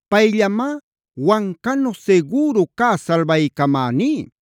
Payllamá wancanu sigüru cä salbaycamäní.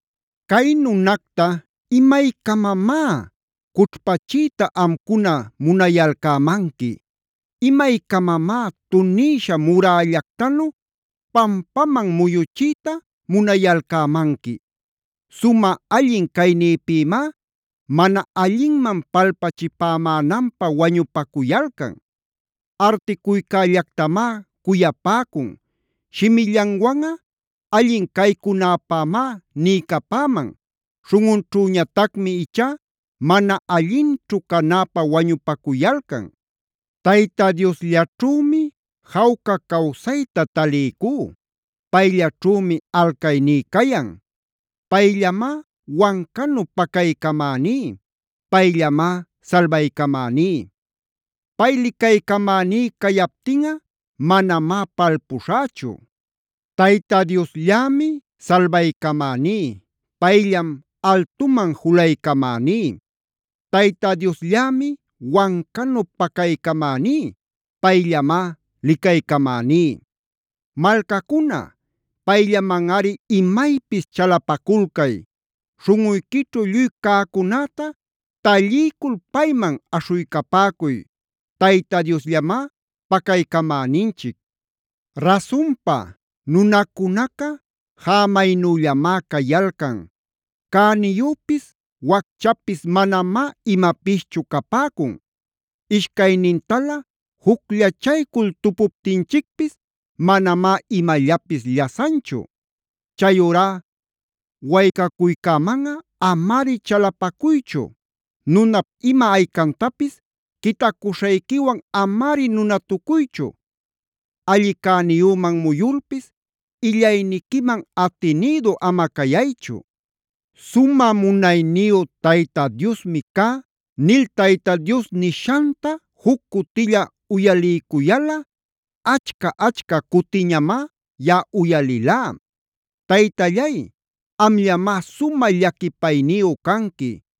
¿Cay nunacta imaycamamá cućhpachiyta amcuna munayalcämanqui? ¿Imaycamamá tunïsha murällactanu pampaman muyuchiyta munayalcämanqui? Sumä allin caynïpïmá mana allinman palpachipämänanpä wañupacuyalcan. Articuycällactamá cuyapäcun. Shimillanwanꞌa allin caycunäpämá niycapäman. Śhunꞌunćhüñatacmi ichá mana allinćhu canäpä wañupacuyalcan. Tayta Diosllaćhümi jawca cawsayta taliycú. Payllaćhümi alcayní cayan. Payllamá wancanu pacaycamäní; payllamá salbaycamäní. Pay licaycamäní cayaptinꞌa manamá palpuśhächu. Tayta Diosllämi salbaycamäní; payllam altuman julaycamäní. Tayta Diosllämi wancanu pacaycamäní; payllamá licaycamäní. Malcacuna, ¡payllamanꞌari imaypis chalapaculcay! ¡Śhunꞌuyquićhu lluy cäcunäta talliycul payman aśhuycapäcuy! ¡Tayta Diosllamá pacaycamäninchic! Rasunpa, nunacunaca jämaynüllamá cayalcan. Cäniyüpis wacchapis manamá imapischu capäcun. Ishcaynintalä jucllachaycul tupuptinchicpis manamá imallapis llasanchu. Chayurá waycacuycämanꞌa amari chalapacuychu. Nunap ima aycantapis quitacuśhayquiwan amari nunatucuychu. Alli cäniyüman muyulpis illayniquiman atinïdu ama cayaychu. “Sumä munayniyu Tayta Diosmi cá” nil Tayta Dios nishanta juc cutilla uyaliycuyalꞌa achca-achca cutiñamá yaꞌa uyalilá. Taytallay, amllamá sumä llaquipayniyu canqui.